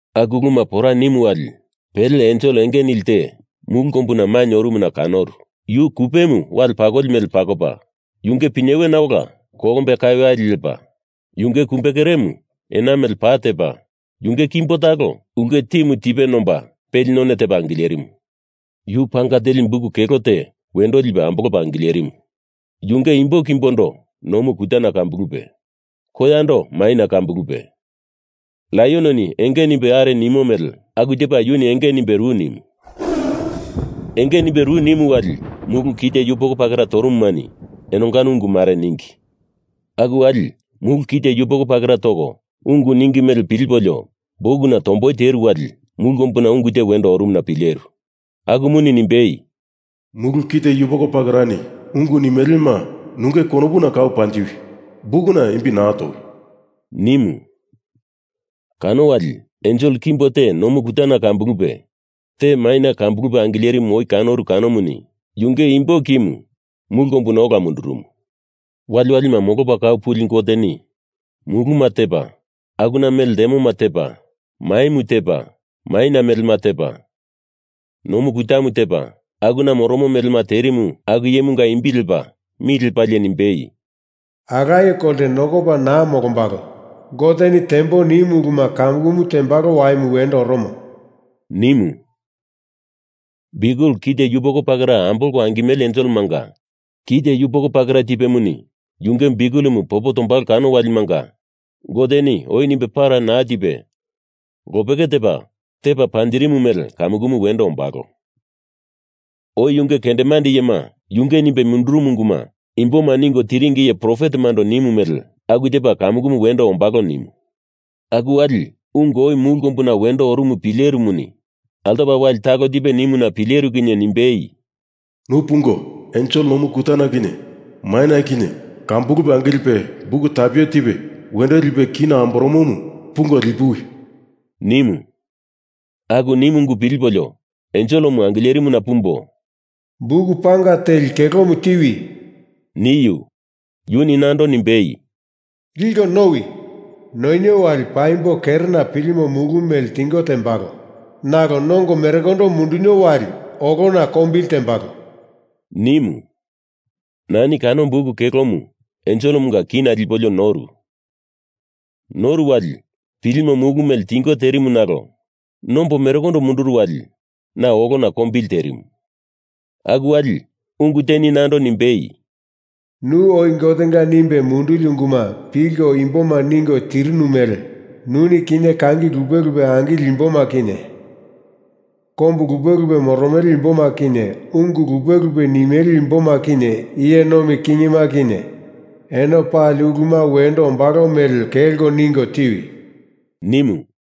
Aku uluma pora nimu wali pele ensel enge nili te mulu kombuna mainye orumuna kanoru. Yu kupemu wale pakoli mele pakopa, yunge pinyewena ola kolombe kaweyali lepa, yunge kumbe keremu ena mele pa tepa, yunge kimbo talo ulke timu tipe nomba peli none tepa angilerimu. Yu panga teli buk kelo te wendo lipe ambolopa angilerimu. Yunge imbo kimbondo nomu kutana kambulupe, koyando maina kambulupe, laiononi enge nimbe are nimo mele aku tepa yuni enge nimbe ru nimu. Enge nimbe ru nimu wali mulu kite yupoko pakera torumumani enongano ungu mare ningi. Aku wali mulu kite yupoko pakera toko ungu ningi mele pilipolio bukuna tomboi teru wali mulu kombuna ungu te wendo orumuna pileru. Akumuni nimbei, “Mulu kite yupoko pakerani ungu nimelema nunge konopuna kau panjiwi! Bukuna imbi naa towi!” nimu. Kano wali ensel kimbo te nomu kutana kambulupe te maina kambulupe angilerimu oi kanoru kanomuni yunge imbo kimu mulu kombuna ola mundurumu. Waliwalima molopa kau puli Goteni muluma tepa akuna mele ltemoma tepa, maimu tepa maina melema tepa, nomu kutamu tepa akuna moromo melema terimu aku iyemunga imbi lepa mi lepalie nimbei, “Alaye kolte nokopa naa molombalo. Goteni tembo nimu uluma kamukumu tembalo waimu wendo oromo,” nimu. Biukel kite yupoko pakera ambolko angimele enselemanga kite yupoko pakera tipemuni yunge biukelemu popo tombalo kano walimanga Goteni oi nimbe para naa tipe lopeke tepa tepa panjirimu mele kamukumu wendo ombalo. Oi yunge kendemande iyema yunge nimbe mundurumu unguma imboma ningo tiringi iye profetemando nimu mele, aku tepa kamukumu wendo ombalo nimu. Aku wali ungu oi mulu kombuna wendo orumu pilerimuni altopa wali talo tipe nimuna pileru kinye nimbei, “Nu pungo, ensel nomu kutana kinye maina kinye kambulupe angilipe buk tapuwe tipe wendo lipe kina amboromomu pungo lipuwi!” nimu. Aku nimu ungu pilipolio enselemu angilerimuna pumbo, “Buku panga teli kelomu tiwi!” niu. Yuni nando nimbei, “Liko nowi! Nonio wali paimbo kerena pilimo mulu mele tingo tembalo nalo nongo merekondo mundunio wali olona kombili tembalo,” nimu. Nani kano buk kelomu enselemunga kina lipolio noru. Noru wali pilimo mulu mele tingo terimu nalo nombo merekondo munduru wali na olona kombili terimu. Aku wali ungu teni nando nimbei, “Nu oi Gotenga nimbe munduli unguma pilko imboma ningo tirinu mele nuni kinye kangi lupe lupe angileli imboma kinye, kombu lupe lupe moromele imboma kinye, ungu lupe lupe nimele imboma kinye iye nomi kingima kinye, eno pali uluma wendo ombalo mele kelko ningo tiwi!” nimu.